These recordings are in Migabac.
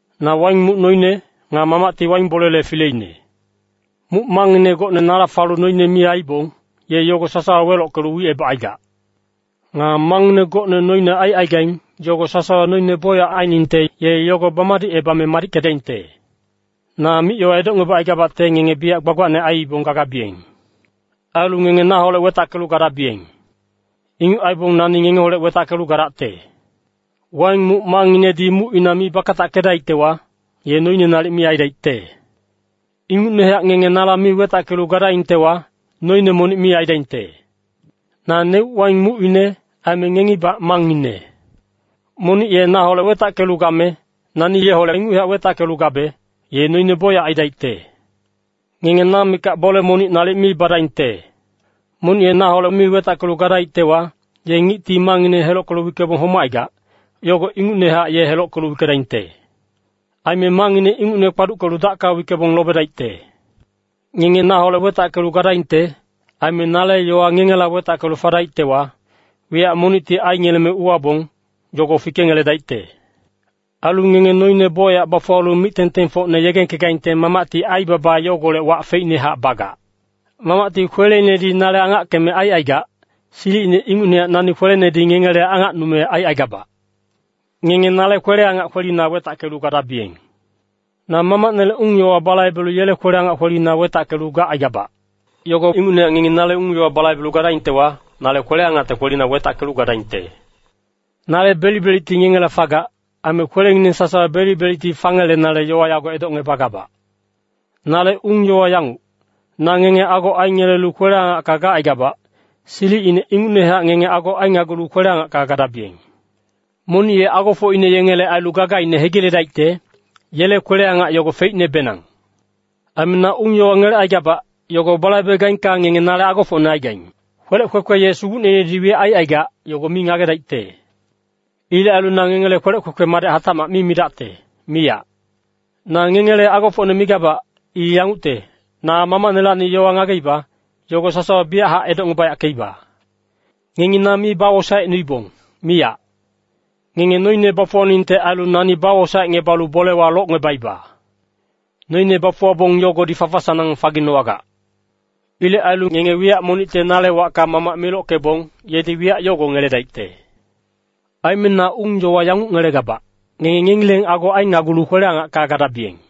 “Na waing muc noine. Nga Mamacti waing bolele fileine. Muc mangngine gocne nala falu noine mi aibong, ye yogo sasawa welockelu wicebacaigac. Nga mangngine gocne noine aicaigaing, yogo sasawa noine bocyac ainingte, ye yogo bamadicebame madickedaingte. Na mic-yowa edocngebacaigabacte ngenge biyac gbagbacne aiibong gagabiyeng. Ailu ngenge naholec wetackelu gadabiyeng. Inguc aibong nani ngengeholec wetackelu gadacte. Waing muc mangnginedi mucina mi bakatackedaictewa, ye noine nalic mi aidaicte. Ingucnehac ngenge naholec mi wetackelu gadaingtewa, noine monic mi aidaingte. “Naneuc waing mucine, aime ngengibac mangngine. Monic ye naholec wetackelu game, nani yeholec inguchac wetackelu gabe, ye noine bocyac aidaicte. Ngenge na mikac bole monic nalic mi badaingte. Monic ye naholec mi wetackelu gadaictewa, ye ngicti mangngine helockelu wickebong homacaigac, yogo ingucnehac ye helockelu wickedaingte. Aime mangngine ingucne kpaduckelu dacka wickebong lobedaicte. Ngenge naholec wetackelu gadaingte. Aime nale yowa ngengela wetackelu fadaictewa, wiyac monicte aingeleme uwabong, yogo fikengeledaicte. Ailu ngenge noine bocyac bafuwalu mic-tengtengfocne yegengkegaingte Mamacti aibaba yogolec wac feicnehac bagac. “Mamacti kweleinedi nale angackeme aicaigac, silicine ingucnehac nani kwelenedi ngengele angacnume aicaigabac. Ngenge nale kwele-angac kwelina wetackelu gadabiyeng. Na Mamacnele ung-yowa balaibelu yele kwele-angac kwelina wetackelu gacaigabac. Yogo ingucnehac ngengi nale ung-yowa balaibedaingtewa, nale kwele-angacte kwelina wetackelu gadaingte. Nale belic-belicti ngengela fagac. Aime kwelengineng sasawa belic-belicti fangelenale yowa yago edocngebagabac. “Nale ung-yowa yanguc, na ngenge ago aingelelu kwele-angacka gacaigabac, silicine ingucnehac ngenge ago ainagulu kwele-angacka gadabiyeng. Monic ye agofocine yengele ailu gagaine hegiledaicte, yele kwele-angac yogo feicnebenang. Aime na ung-yowa ngelecaigabac, yogo balaibegaingka ngenge nale agofocne aigaing. “Kwelec kwekwe ye sugucneinedi wiyac aicaigac, yogo mi ngagedaicte. Ilec ailu na ngengele kwelec kwekwe madec hatacmac mi midacte, miyac. Na ngengele agofocne migabac. I yangucte, na Mamacnelacni yowa ngageiba, yogo sasawa biyachac edocngebayackeiba. Ngengi na mi bawosaecnuibong, miyac. Ngenge noine bafuwaningte ailu nani bawosaecngebalu bolewa locngebaiba. Noine bafuwabong yogodi fafa-sanang faginowagac. Ilec ailu ngenge wiyac monicte nale wacka Mamac milockebong, yedi wiyac yogo ngeledaicte. Aime na ung-yowa yanguc ngelegabac, ngenge ngengileng ago ainagulu kwele-angacka gadabiyeng.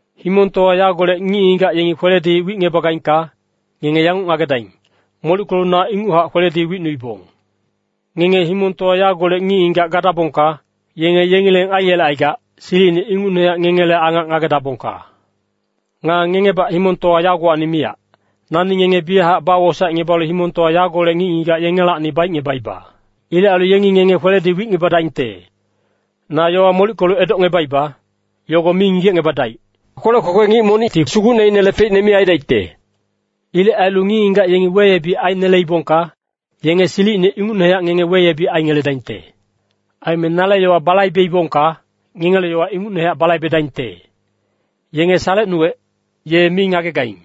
“Himongtowa yagolec ngic-ngigac yengi kweledi wicngebagaingka, ngenge yanguc ngagedaing, molickelu na inguchac kweledi wicnuibong. Ngenge himongtowa yagolec ngic-ngigac gadabongka, yenge yengileng aiyelecaigac, silicine ingucnehac ngengele angac ngagedabongka. Nga ngengebac himongtowa yagowacni miyac, nani ngenge biyachac bawosaecngebalu himongtowa yagolec ngic-ngigac yengelacni baicngebaiba. Ilec ailu yengi ngenge kweledi wicngebadaingte. Na yowa molickelu edocngebaiba, yogo mi ngigecngebadaic, kwelec kwekwe ngic monicti sugucneinele feicne mi aidaicte. Ilec ailu ngic-ngigac yengi weyebic aineleibongka, yenge silicine ingucnehac ngenge weyebic aingeledaingte. Aime nale yowa balaibeibongka, ngengele yowa ingucnehac balaibedaingte. Yenge salecnuwec, ye mi ngagegaing.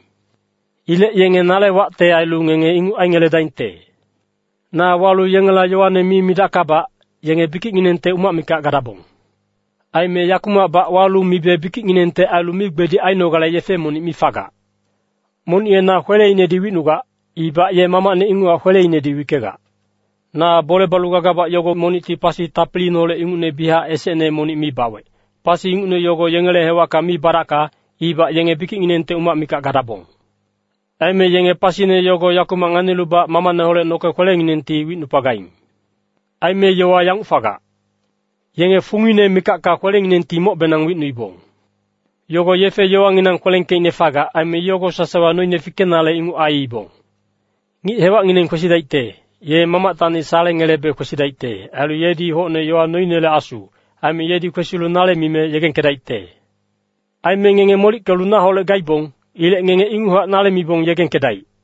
Ilec yenge nale wacte ailu ngenge inguc aingeledaingte. “Na walu yengela yowane mi midackabac, yenge bikicnginengte umac mikac gadabong. Aime yakumacbac walu mibe bikicnginengte ailu migbedic ainogale yefe monic mi fagac. Monic ye na kweleinedi wicnugac, ibac ye Mamacne inguchac kweleinedi wickegac. Na bole balu gagabac yogo monicti pasi tapiliineholec ingucne biyachac esecne monic mi bawec, pasi ingucne yogo yengele hewacka mi badacka, ibac yenge bikicnginengte umac mikac gadabong. Aime yenge pasine yogo yakumac nganilubac Mamacneholec noke kwelenginengti wicnupagaing. Aime yowa yanguc fagac, ‘Yenge fungine mikacka kwelenginengti mocbenang wicnuibong.’ Yogo yefe-yowanginang kwelengkeicne fagac. Aime yogo sasawa noine fikenale inguc aiibong. “Ngic-hewacngineng kwesidaicte, ye Mamactacni salengelebe kwesidaicte. Ailu yedi hocne yowa noinele Asu. Aime yedi kwesilu nale mime yegengkedaicte. Aime ngenge molickelu naholec gaibong. Ilec ngengi inguchac nale mibong yegengkedaic.”